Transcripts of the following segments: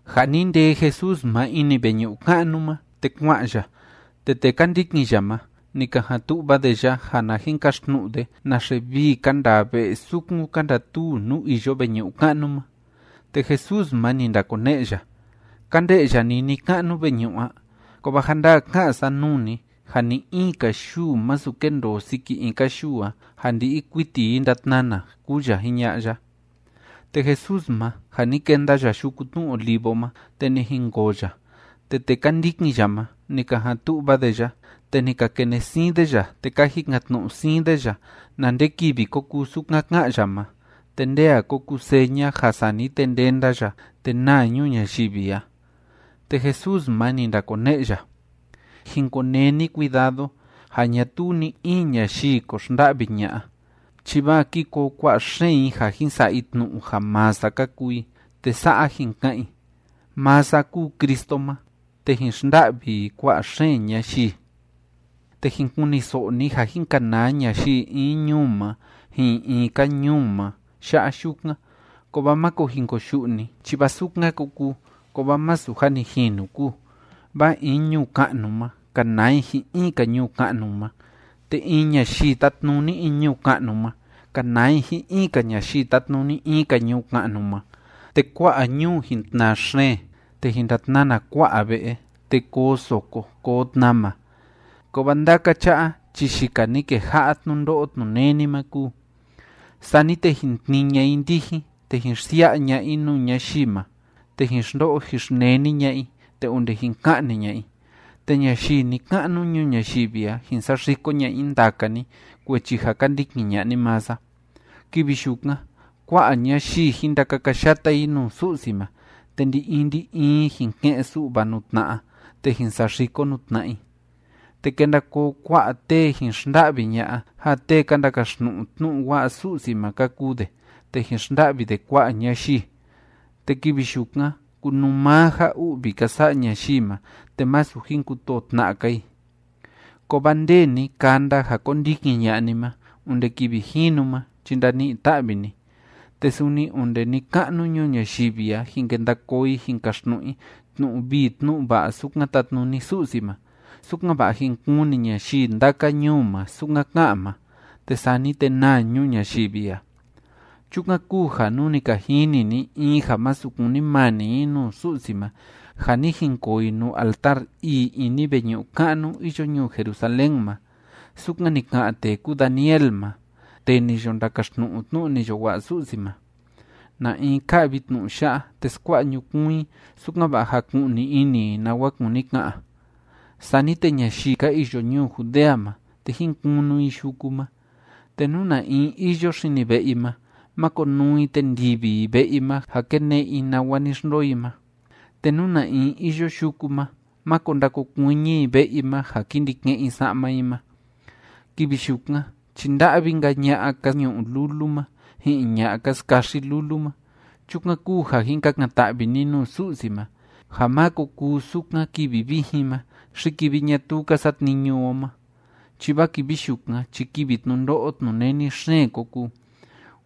Ja ni ndee Jesús ma ini veñu'u ka'nu ma, te kua'an ya, te tee ka ndikin ya ma, ni ka jan tu'va de ya, ja na jin kaxtnu'u de naxe vii ka ndaa ve'e sukun ka ndatuu nuu iyo veñu'u ka'nu ma. Te Jesús ma, ni ndakone'e ya: ―¿Ka nde'ya ni ni‑ka'nu veñu'u a? Kovaa ja ndaa ká'an sa nuu ni ja ni‑in‑ka yuu masu kendoo siki in‑ka yuu a, ja ndi'i kuiti i ndatnana ―kúu ya jiña'a ya. Te Jesús ma, ja ni kenda ya Yuku Tnu Olivo ma, te ni jinkoo ya, te tee ka ndikin ya ma, ni ka jan tu'va de ya, te ni ka kene'e siin de ya, te ka jikan‑tnu'u siin de ya na nde kivi ko kuu sukan ká'an ya ma, te nde a ko kuu seña, ja sani te ndenda ya te naa ñuu ñayivi a. Te Jesús ma, ni ndakone'e ya: ―Jin konee ni cuidado ja ñatuu ni‑in ñayii ko xnda'vi ña'a, chi vaa ki koo kua'a xeen i ja jin sa'a i tnu'u ja maa sa ka kuu i, te sa'a jin ka'an i: “Maa sa kúu Cristo ma”, te jin xnda'vi i kua'a xeen ñayii. ’Te jin kuniso'o ni ja jin kanaa ñayii in ñuu ma ji'in in‑ka ñuu ma ya'a yukan. Kovaa máko jin koyu'u ni, chi vaa sukan ko kuu, kovaa masu jâ ni jinu kúu. Vaa in ñuu ka'nu ma, kanaa i ji'in in‑ka ñuu ka'nu ma, te in ñayii tátnuni in ñuu ka'nu ma, kanaa i ji'in in‑ka ñayii tátnuni in‑ka ñuu ka'nu ma, te kua'a ñuu jin tnaa xeen, te jin ndatnana kua'a ve'e, te koo soko koo tnama. Kovaa ndaka cha'a chi yika ni keja'a tnundo'o tnuneni ma kúu. ’Sani te jin tnii ña'a i ndijin, te jin xsia'a ña'a i nuu ñayii ma, te jin xndo'o jin xneni ña'a i, te onde jin ka'ni ña'a i, te ñayii ni‑ka'nu ñuu ñayivi a, jin saxiko ña'a i ndaka ni kuechi ja ka ndikin ña'a ni maa sa. Kivi yukan, kua'a ñayii, jin ndakakayata i nuu Su'si ma, te ndi‑in ndi‑in i jin ke'en‑su'va nuu tna'a, te jin saxiko nuu tna'a i. Te kenda koo kua'a tee jin xnda'vi ña'a ja tee ka ndakaxtnu'u tnu'u wa'a Su'si ma ka kuu de, te jin xnda'vi de kua'a ñayii. Te kivi yukan kunuu maa ja u'vi ka sa'a ñayii ma, te masu jin kutoo tna'a‑ka i. Kovaa nde ni kanda ja kondikin ña'a ni ma onde kivi jinu ma chi ndani'i‑ta'vi ni. Te suni onde ni‑ka'nu ñuu ñayivi a jin kenda koo i jin kaxtnu'u i tnu'u vii tnu'u va'a sukan tatnuni Su'si ma, sukan‑va'a jin kuni ñayii ndaka ñuu ma sukan ká'an ma. Te sani te naa ñuu ñayivi a. ’Chukan kúu ja nú ni ka jini ni in ja masu kunimani i nuu Su'si ma ja ni jinkoo i nuu altar ii ini veñu'u ka'nu iyo ñuu Jerusalén ma, sukan ni ka'an tee kúu Daniel ma, tee ni yo ndakaxtnu'u tnu'u ni yo wa'a Su'si ma, (na in ká'vi tnu'u ya'a, te skua'a ñukuun i, sukan‑va'a jaku'ni ini i nawa kúni ka'an), sani te ñayii ka iyo ñuu Judea ma, te jín kunu i yuku ma. Te nú na in iyo xini ve'e i ma, máko nuu i te ndivi i ve'e i ma ja kene'e i nawa ni xndoo i ma. Te nú na in iyo yuku ma, máko ndakokuiñi i ve'e i ma ja ki ndi ke'en i sa'ma i ma. ¡Kivi yukan chi nda'vi‑nka ña'a ka ñu'u lulu ma, ji'in ña'a ka skaxi lulu ma! Chukan kúu ja jin kakan‑ta'vi ni nuu Su'si ma, ja má ko kuu sukan kivi vijin ma, xi kivi ñatuu ka satniñu o ma, chi vaa kivi yukan chi kivi tnundo'o tnuneni xeen ko kuu,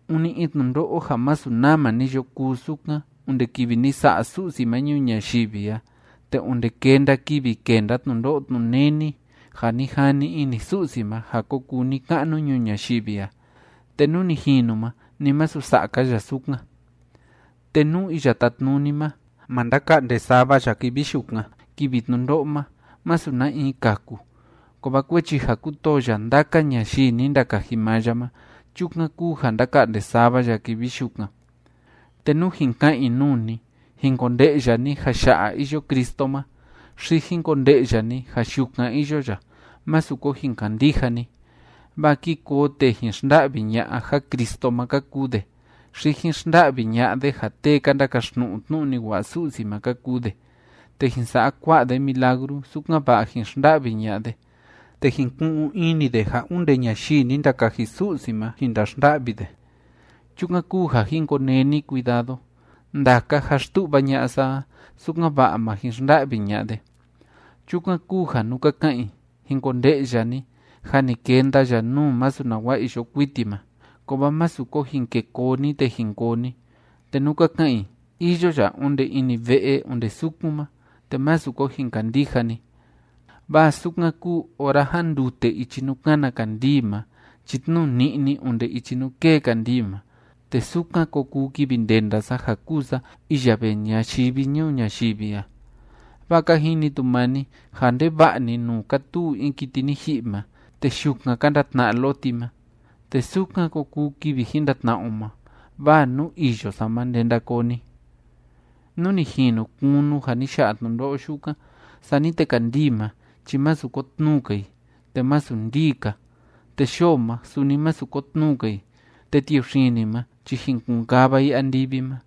ûni in tnundo'o ja masu nama ni yo kuu sukan onde kivi ni sa'a Su'si ma ñuu ñayivi a, te onde kenda kivi kenda tnundo'o tnuneni ja ni jani ini Su'si ma ja ko kuu ni‑ka'nu ñuu ñayivi a, te nú ni jinu ma, ni masu sa'a‑ka ya sukan. Te nú Iya Tátnuni ma, ma ndaka'nde sava ya kivi yukan, kivi tnundo'o ma, masu na in kaku, kovaa kuechi ja kútoo ya ndaka ñayii ni ndakaji maa ya ma, chukan kúu ja ndaka'nde sava ya kivi yukan. ’Te nú jin ka'an i nuu ni: “Jin konde'ya ni ja ya'a iyo Cristo ma”, xi “Jin konde'ya ni ja yukan iyo ya”, másu ko jin kandija ni. Vaa ki koo tee jin xnda'vi ña'a ja Cristo ma ka kuu de, xi jin xnda'vi ña'a de ja tee ka ndakaxtnu'u tnu'u ni wa'a Su'si ma ka kuu de, te jin sa'a kua'a de milagru, sukan‑va'a jin xnda'vi ña'a de, te jin ku'un ini de ja onde ñayii ni ndakaji Su'si ma jin ndaxnda'vi de. ¡Chukan kúu ja jin konee ni cuidado! Ndaka jâ xtu'va ña'a sa a, sukan‑va'a ma jin xnda'vi ña'a de. Chukan kúu ja nú ka ka'an i: “Jin konde'ya ni jâ ni kenda ya nuu masu nawa iyo kuiti ma”, kovaa másu ko jin ke koo ni te jin koo ni. Te nú ka ka'an i: “Iyo ya onde ini ve'e onde sukun ma”, te másu ko jin kandija ni. Vaa sukan kúu ora jándute ichi nuu kána kandii ma chi tnuu ni'ni onde ichi nuu kée kandii ma, te sukan ko kuu kivi ndenda sa ja kúu sa iya vee ñayivi ñuu ñayivi a. Vaa ka jini tu maa ni ja ndeva'a‑ni nuu kátuu in kiti ni ji'i ma, te yukan ka ndatna'a loti ma. Te sukan ko kuu kivi jin ndatna'a o ma, vaa nuu iyo sa ma ndenda koo ni. ’Nú ni jinu kunu ja ni ya'a tnundo'o yukan, sani te kandii ma chi masu kotnuu‑ka i, te masu ndii‑ka, te yoo ma, suni masu kotnuu‑ka i, te tiuxini ma chi jin kun‑kava i andivi ma,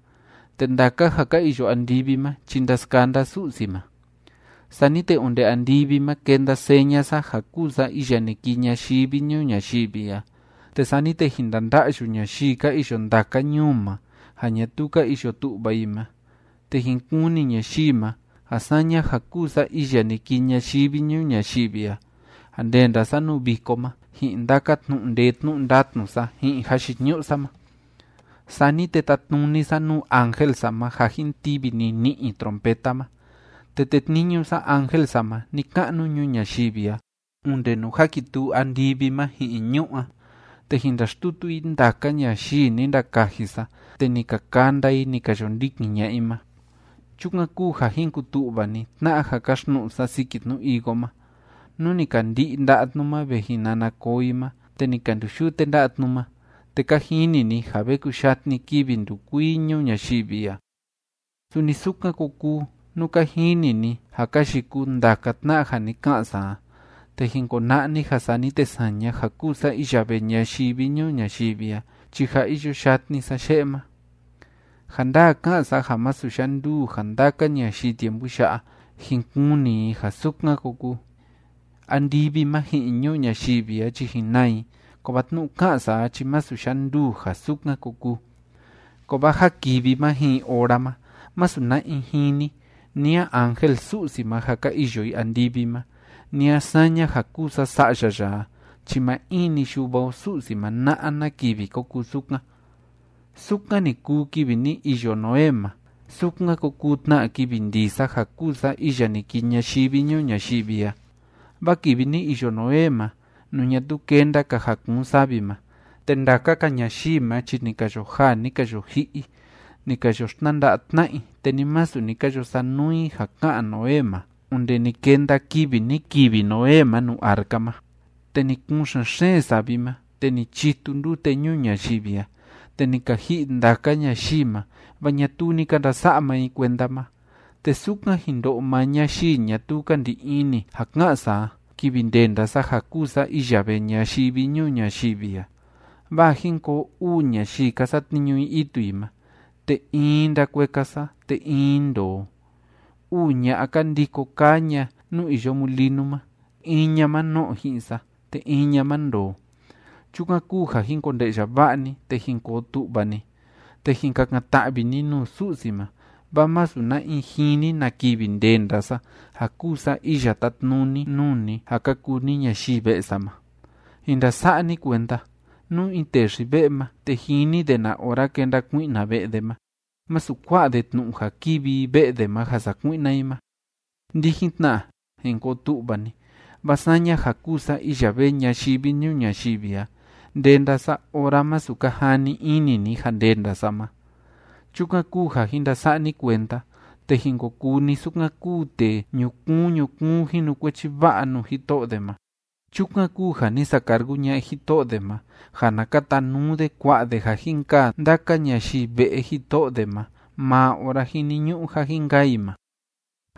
te ndaka ja ka iyo andivi ma chi ndaskanda Su'si ma. Sani te onde andivi ma kenda seña sa ja kuu sa iya ni kii ñayivi ñuu ñayivi a, te sani te jin ndanda'yu ñayii ka iyo ndaka ñuu ma ja ñatuu ka iyo tu'va i ma, te jin kuni ñayii ma ja saña ja kúu sa iya ni kii ñayivi ñuu ñayivi a, ja ndenda sa nuu viko ma ji'in ndaka tnu'u ndee tnu'u ndatnu sa ji'in jayiñu'u sa ma. Sani te tatnuni sa nuu ángel sa ma ja jin tivi nini'i i trompeta ma, te tetniñu sa ángel sa ma ni‑ka'nu ñuu ñayivi a onde nuu jakituu andivi ma ji'in ñu'ú a, te jin ndaxtutu i ndaka ñayii ni ndakaji sa te ni ka kanda i ni ka yo ndikin ña'a i ma. ’Chukan kúu ja jin kutu'va ni tna'a ja káxtnu'u sa siki tnu higo ma. Nú ni ka ndi'i nda'a tnu ma ve jin nana koo i ma te ni ka nduyute nda'a tnu ma, te ka jini ni ja ve kuyatni kivi ndukuii ñuu ñayivi a. Suni sukan ko kuu nú ka jini ni ja ka yikuu ndaka tna'a ja ni ka'an sa a, te jin kona'a ni ja sani te saña ja kúu sa iya vee ñayivi ñuu ñayivi a chi jâ iyo yatni sa ye'e ma. Ja ndaa ká'an sa ja masu yanduu ja ndaka ñayii tiempu ya'a, jin kuni i ja sukan ko kuu. Andivi ma ji'in ñuu ñayivi a chi jin naa i, kovaa tnu'u ká'an sa a chi masu yanduu ja sukan ko kuu. ’Kovaa ja kivi ma ji'in ora ma, masu na in jini, ni a ángel Su'si ma ja ka iyo i andivi ma, ni a saña ja kúu sa Sa'ya ya a chi maa in‑ni Yuva o Su'si ma na'a na kivi ko kuu sukan. ’Sukan ni kuu kivi ni iyo Noé ma, sukan ko kuu tna kivi ndii sa ja kúu sa iya ni kii ñayivi ñuu ñayivi a. Vaa kivi ni iyo Noé ma, nuu ñatuu kenda‑ka ja kuun savi ma, te ndaka‑ka ñayii ma chi ni ka yo jaa, ni ka yo ji'i i, ni ka yo xtnanda'a tna'a i, te ni masu ni ka yo sanuu i ja ká'an Noé ma, onde ni kenda kivi ni kivi Noé ma nuu arca ma, te ni kuun xen‑xeen savi ma, te ni chitu ndute ñuu ñayivi a, te ni ka ji'i ndaka ñayii ma. Vaa ñatuu ni ka ndasa'a maa i kuenda ma. Te sukan jin ndo'o maa ñayii ñatuu ka ndi ini ja ká'an sa a, kivi ndenda sa ja kúu sa iya vee ñayivi ñuu ñayivi a. ’Vaa jin koo uu ñayii ka satniñu i itu i ma. Te in i ndakueka sa, te in i ndoo. Uu ña'a, ka ndiko kaa ña nuu iyo mulinu ma. In ña ma no'o ji'in sa, te in ña ma ndoo. ’Chukan kúu ja jin konde'ya va'a ni, te jin koo tu'va ni, te jin kakan‑ta'vi ni nuu Su'si ma, vaa masu na in jini na kivi ndenda sa ja kúu sa iya tátnuni nuu ni ja ka kuu ni ñayii ve'e sa ma. ’Jin ndasa'a ni kuenda: Nú in tee xi‑ve'e ma, te jini de na ora kenda kui'na ve'e de ma, masu kua'a de tnu'u ja kivi i ve'e de ma ja sakui'na i ma. Ndijin tna, jin koo tu'va ni, vaa saña ja kúu sa iya vee ñayivi ñuu ñayivi a, ndenda sa ora masu ka jani ini ni ja ndenda sa ma. ’Chukan kúu ja jin ndasa'a ni kuenda te jin ko kuu ni sukan kúu tee ñukuun ñukuun jinukuechi va'a nuu jito'o de ma. Chukan kúu ja ni sacargu ña'a jito'o de ma ja na katanuu de kuá'a de ja jin kaa ndaka ñayii ve'e jito'o de ma maa ora jiniñu'u ja jin kaa i ma.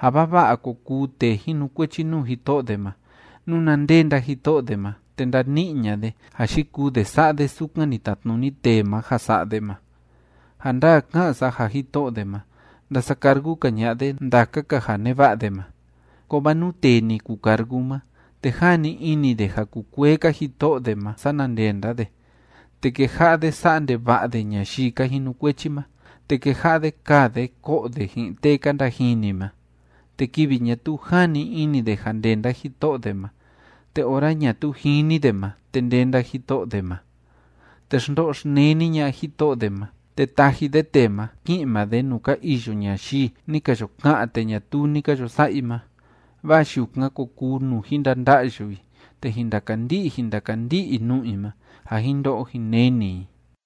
Ja vava'a ko kuu tee jinukuechi nuu jito'o de ma, nuna ndenda jito'o de ma te ndani'i ña'a de ja yikuu de sa'a de sukan ni tatnuni tee ma ja sa'a de ma. Ja ndaa ká'an sa ja jito'o de ma, ndasacargu‑ka ña'a de ndaka‑ka ja neva'a de ma. Kovaa nú tee ni kucargu ma, te jani ini de ja kukuee‑ka jito'o de ma sana ndenda de, te keja'a de sa'a ndeva'a de ñayii ka jinukuechi ma, te keja'a de kaa de ko'o de ji'in tee ka ndajini ma, te kivi ñatuu jani ini de ja ndenda jito'o de ma te ora ñatuu jini de ma, te ndenda jito'o de ma, te xndo'o xneni ña'a jito'o de ma, te taji de tee ma, ki'in maa de nuu ka iyo ñayii ni ka yo ka'an te ñatuu ni ka yo sa'a i ma, vaa yukan ko kuu nuu jin ndanda'yu i, te jin ndakandi'i jin ndakandi'i i nu'u i ma ja jin ndo'o jin neni i.